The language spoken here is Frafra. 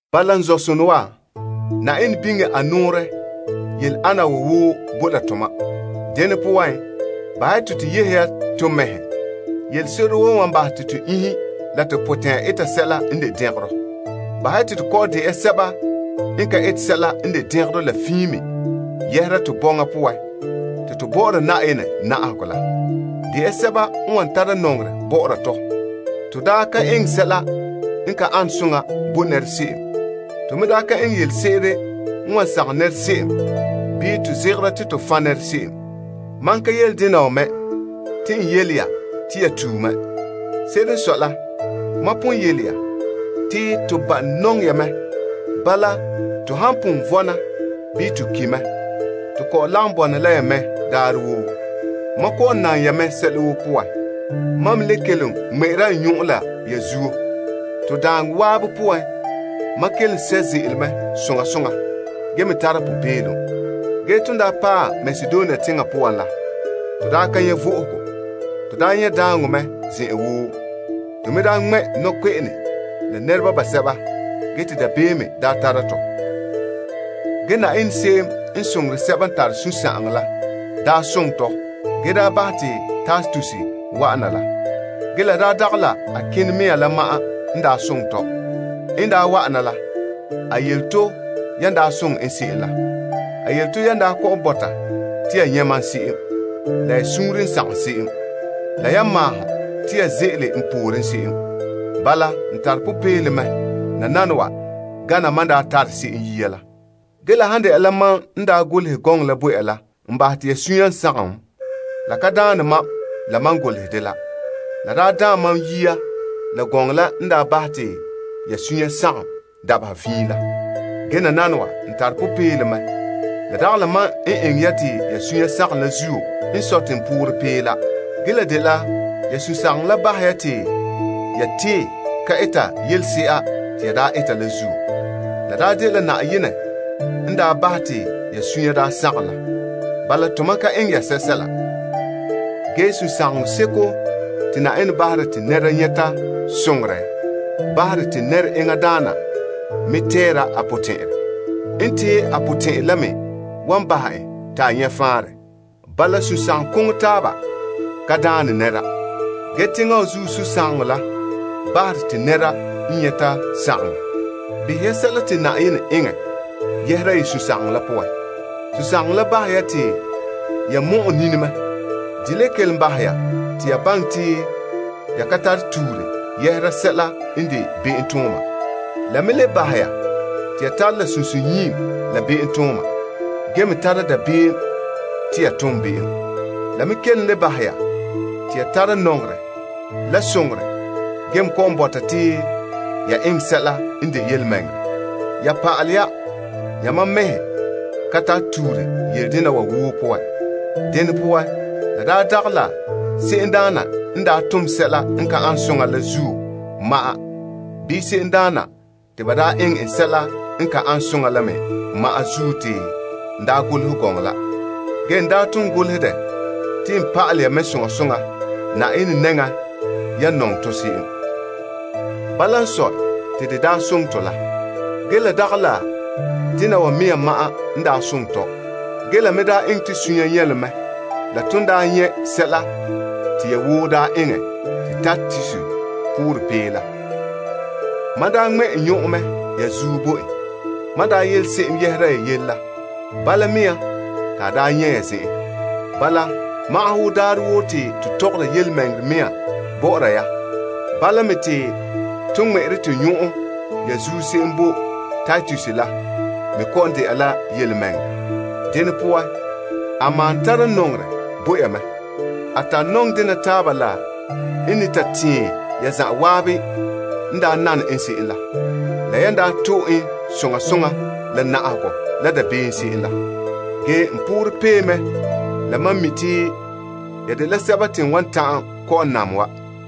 Bala, n zɔ'sonɔ wa, Na'ayenɛ biŋe a nɔɔrɛ yele ana wa woo boe la tomam. Dene poan, bahɛ ya te to yehe ya to mɛhe yelese'ere woo n wan bahɛ te to iŋhe la to potɛn'ya eta sɛla n de dɛngerɔ. Bahɛ ya te to kɔ'ɔn de ya sɛba n ka eta sɛla n de dɛngerɔ la fiin me yɛhera to bɔŋa poan te to bɔ'ɔra Na'ayenɛ na'ahegɔ la. De ya sɛba n wan tara nɔŋerɛ bɔ'ɔra tɔ. To daa ka eŋɛ sɛla n ka ane soŋa bo se'em. To me daa ka eŋɛ yelese'ere n wan sagom se'em bii to zegera te to fan' se'em. Mam ka yele dena wa mɛ te n yele ya te ya tue mɛ. Se'ere n sɔe la, mam pon yele ya te to ba'a nɔŋɛ ya mɛ. Bala to han pon vɔna bii to ki' mɛ, to kɔ'ɔn lagom bɔna la ya daarɛ woo. Mam kɔ'ɔn nam ya mɛ sɛla woo poan. Mam me le kelom ŋmɛ'ɛra n nyɔn'ɔn la ya zuo. To daaŋɔ zan'an poan, mam kelom sɛ' ze'ele mɛ soŋa soŋa ge me tara popeelom. Ge ton daa paɛ Makedonia teŋa poan la, to daa ka nyɛ' vo'ohogo. To daa nyɛ' daaŋɔ mɛ zen'an woo, la nɔkpe'ene la nɛreba basɛba ge te dabeem daa tara tɔ. Ge Na'ayenɛ se'em n soŋore sɛba n tare sunsagaŋɔ la daa soŋɛ tɔ ge daa bahɛ te Titus wa'ana la. Ge la daa dagɛ la a kene mea la ma'an n daa soŋɛ tɔ. N daa wa'ana la, a yele to yan daa soŋɛ en se'em la. A yele to yan kɔ'ɔn bɔta te ya nyɛ' mam se'em, la ya suunre n sagom se'em, la yan maahom te ya ze'ele n pooren se'em. Bala, n tare popeelom mɛ nananawa gana mam daa tare se'em yia la. Ge la han dɛna la mam n daa golehɛ gɔŋɔ la bo ya la n bahɛ te ya sunya sagom, la ka daane mam la mam n golehɛ dela. La daa daam mam yia la gɔŋɔ la n daa bahɛ ya te ya sunya sagom dabeha fiin la. Ge nananawa, n tare popeelom mɛ. La dagɛ la mam n eŋɛ ya te ya sunya sagom la zuo n sɔe te n poorɛ pee la. Ge la dela ya sunsagaŋɔ la bahɛ ya te ya tee ka eta yelese'a te ya daa eta la zuo. La daa dela Na'ayenɛ n daa bahɛ te ya sunya daa sagom la. Bala tomam ka eŋɛ ya sɛla. Ge sunsagaŋɔ seko te Na'ayenɛ bahera te nɛra nyɛta soŋore nɛra enŋa daana mɛ te a tɛɛra a potɛn'ɛrɛ. N tee a potɛn'ɛrɛ la me wan bahɛ en te a nyɛ faanrɛ. Bala, sunsagaŋɔ koŋɔ taaba ka daane nɛra. Ge teŋa wa zuo sunsagaŋɔ la bahere mɛ te nɛra n nyɛta la sagaŋɔ. Behɛ ya sɛla te Na'ayenɛ eŋɛ yɛhera ya sunsagaŋɔ la poan. Sunsagaŋɔ la bahɛ ya te ya mɔ'ɛ nini mɛ. De la kelom bahɛ ya te ya baŋɛ te ya ka tare tuure yɛhera sɛla n de be'em. Ya tara la sunsunyiim la be'emtooma ge me tara dabeem te ya ton be'em. La me kelom le bahɛ ya te ya tara nɔŋerɛ la soŋorɛ ge me kɔ'ɔn bɔta te ya eŋɛ sɛla n de yelemɛŋɛrɛ. Ya pa'alɛ ya yamam mɛhe ka tare tuure yele dena wa woo poan. Dene poan, la daa dagɛ la se'emdaana n daa tom sɛla n ka ane soŋa la zuo ma'an bii se'emdaana te ba tue la ma'an zuo te n daa golehɛ gɔŋɔ la. Ge n daa ton golehɛ dɛ te n pa'alɛ ya mɛ soŋa soŋa Na'ayenɛ nɛŋan yan nɔŋɛ to se'em. Bala n sɔe te de daa soŋɛ tɔ la. Ge la dagɛ la dena wa mea ma'an n daa soŋɛ tɔ. Ge la me daa eŋɛ to sunya nyɛlom mɛ la ton daa nyɛ sɛla te ya woo daa eŋɛ te Titus poorɛ pee la. Mam daa ŋmɛ' n nyɔn'ɔn mɛ ya zuo bo en. Mam daa yele se'em yɛhera ya yele la, bala te a daa nyɛ' ya zen'en. Wo daarɛ woo te to tɔgɔre yelemɛŋɛrɛ mea bɔ'ɔra ya, bala me te ton ŋmɛ'ɛre to nyɔn'ɔnrɔ ya zuo se'em bo Titus la me kɔ'ɔn dɛna la yelemɛŋɛrɛ. Dene poan, a malom tara nɔŋerɛ bo ya mɛ. A tare nɔŋdena taaba la n ne ta tɛɛn ya zan'an n daa nane en se'em, la yan daa to'e en soŋa soŋa la na'ahegɔ la dabeem se'em la. Ge n poorɛ pee mɛ la mam mi' te ya dela sɛba te n wan ta'an kɔ'ɔn nam wa.